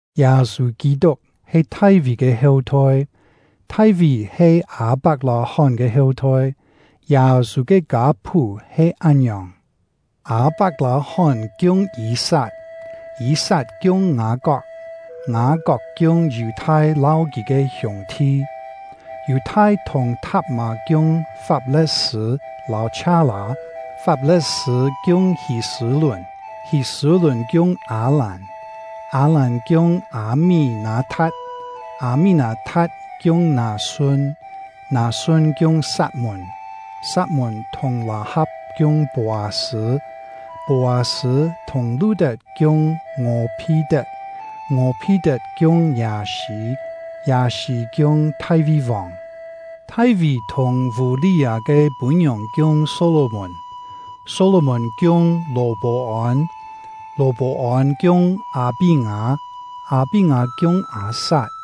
Yâ-sû Kî-tuk he Thai-ví ke heu-thoi, Thai-ví he Â-pak-lâ-hón ke heu-thoi. Yâ-sû ke kâ-phú he án-ngiòng: Â-pak-lâ-hón kiung Yî-sat, Yî-sat kiung Ngâ-kok, Ngâ-kok kiung Yù-thai lâu kì ke hiûng-thi. Yù-thai thùng Thap-mâ kiung Fap-le̍t-sṳ̂ lâu Chhia-lâ, Fap-le̍t-sṳ̂ kiung Hî-sṳ̂-lùn, Hî-sṳ̂-lùn kiung Â-làn, Â-làn kiung Â-mí-nâ-tha̍t, Â-mí-nâ-tha̍t kiung Nâ-sun, Nâ-sun kiung Sat-mùn, Sat-mùn thùng Lâ-ha̍p kiung Pô-â-sṳ̂, Pô-â-sṳ̂ thùng Lu-tet kiung Ngò-phi-tet, Ngò-phi-tet kiung Yâ-sî, Yâ-sî kiung Thai-ví-vòng. Thai-ví thùng Vû-li-â ke pû-ngiòng kiung Só-lò-mùn, Só-lò-mùn kiung Lò-pô-ôn, Lò-pô-ôn kiung Â-pí-ngâ, Â-pí-ngâ kiung Â-sat,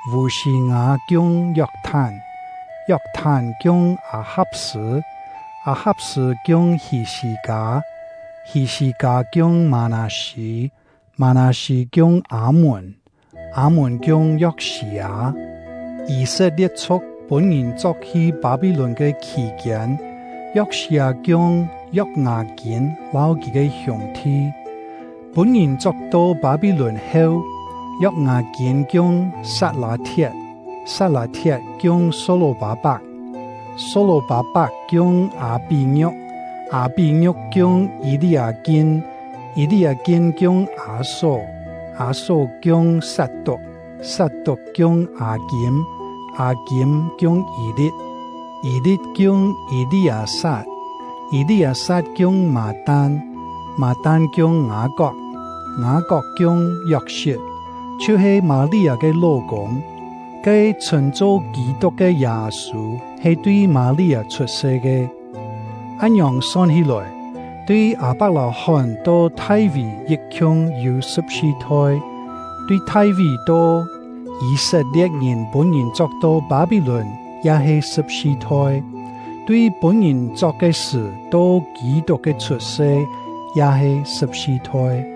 Vû-sî-ngâ kiung Yok-thán, Yok-thán kiung Â-ha̍p-sṳ̂, Â-ha̍p-sṳ̂ kiung Hî-sî-kâ, Hî-sî-kâ kiung Mâ-nâ-sî, Mâ-nâ-sî kiung Â-mùn, Â-mùn kiung Yok-sî-â. Yî-set-lie̍t-chhu̍k pûn-ngìn chok-hi Pâ-pí-lùn ke khì-kiên, Yok-sî-â kiung Yok-ngâ-kîn lâu kì ke hiûng-thi. Pûn-ngìn chok-to Pâ-pí-lùn heu, Yok-ngâ-kîn kiung Sat-lâ-thiet, Sat-lâ-thiet kiung Só-lò-pâ-pak, Só-lò-pâ-pak kiung Â-pí-ngiu̍k, Â-pí-ngiu̍k kiung Yî-li-â-kin, Yî-li-â-kin kiung Â-só, Â-só kiung Sat-tuk, Sat-tuk kiung Â-kîm, Â-kîm kiung Yî-li̍t, Yî-li̍t kiung Yî-li-â-sat, Yî-li-â-sat kiung Mâ-tan, Mâ-tan kiung Ngâ-kok, Ngâ-kok kiung Yok-sit, chhiu-he Mâ-li-â ke ló-kûng. Ke chhṳ̂n-cho Kî-tuk ke Yâ-sû he tui Mâ-li-â chhut-se ke. Án-ngiòng son hí-lòi, tui Â-pak-lâ-hón to Thai-ví yit-khiung yû sṳ̍p-si thoi, tui Thai-ví to Yî-set-lie̍t-ngìn pûn-ngìn chok-to Pâ-pí-lùn ya he sṳ̍p-si thoi, tui pûn-ngìn chok ke sṳ̀ to Kî-tuk ke chhut-se ya he sṳ̍p-si thoi.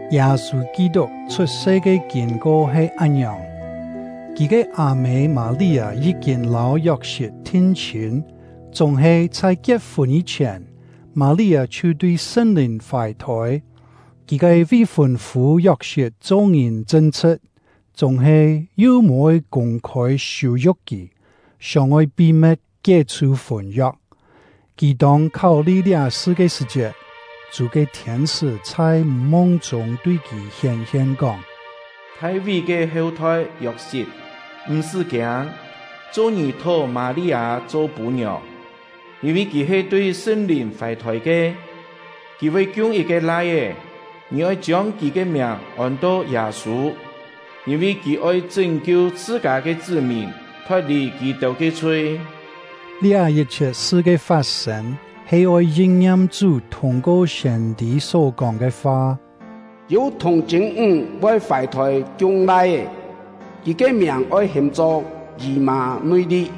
Yâ-sû Kî-tuk chhut-se ke kîn-ko he án-ngiòng: Kì ke â-mê Mâ-li-â yí-kîn lâu Yok-sit thin-chhîn, chúng-he chhai kiet-fûn yî-chhièn, Mâ-li-â chhiu tui Sṳn-Lìn fài-thôi. Kì ke vi-fûn-fû Yok-sit cho-ngìn chṳn-chhṳ̍t, chúng-he yu mò-oi kûng-khôi siû-yu̍k kì, sióng-oi pi-me̍t kié-chhù fûn-yok. Kì tông kháu-li liá-sṳ ke sṳ̀-chiet, Chú ke thiên-sṳ́ chhai mung-chûng tui kì hién-hien, kóng: “Thai-ví ke heu-thoi Yok-sit, m̀-sṳ́ kiâng, cho-ngì thó Mâ-li-â cho pû-ngiòng, yîn-vi kì he tui Sṳn-Lìn fài-thôi ke. Kì voi kiung yit-ke lai-é, ngì oi chiông kì ke miàng ôn-to Yâ-sû, yîn-vi kì oi chṳ́n-kiu chhṳ-kâ ke chṳ́-mìn thot-lì kì-têu ke chhui.” Liá yit-chhiet sṳ ke fat-sên he oi yin-ngiam Chú thûng-ko siên-tî só-kóng ke fa: Yû thùng-chṳ̂n-ńg voi fài-thôi kiung lai-é, kì ke miàng oi ham-cho Yî-mâ-nui-li.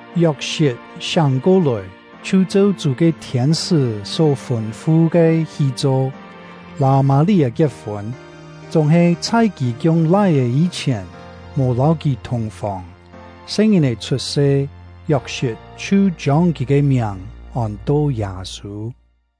Yok-sit siáng ko-lòi, chhiu cheu Chú ke thiên-sṳ́ só fûn-fu ke hi cho, lâu Mâ-li-â kiet-fûn; chúng-he chhai kì kiung lai-é yî-chhièn, mò lâu kì thùng-fòng. Se-ngìn-è chhut-se, Yok-sit chhiu chiông kì ke miàng ôn-to Yâ-sû.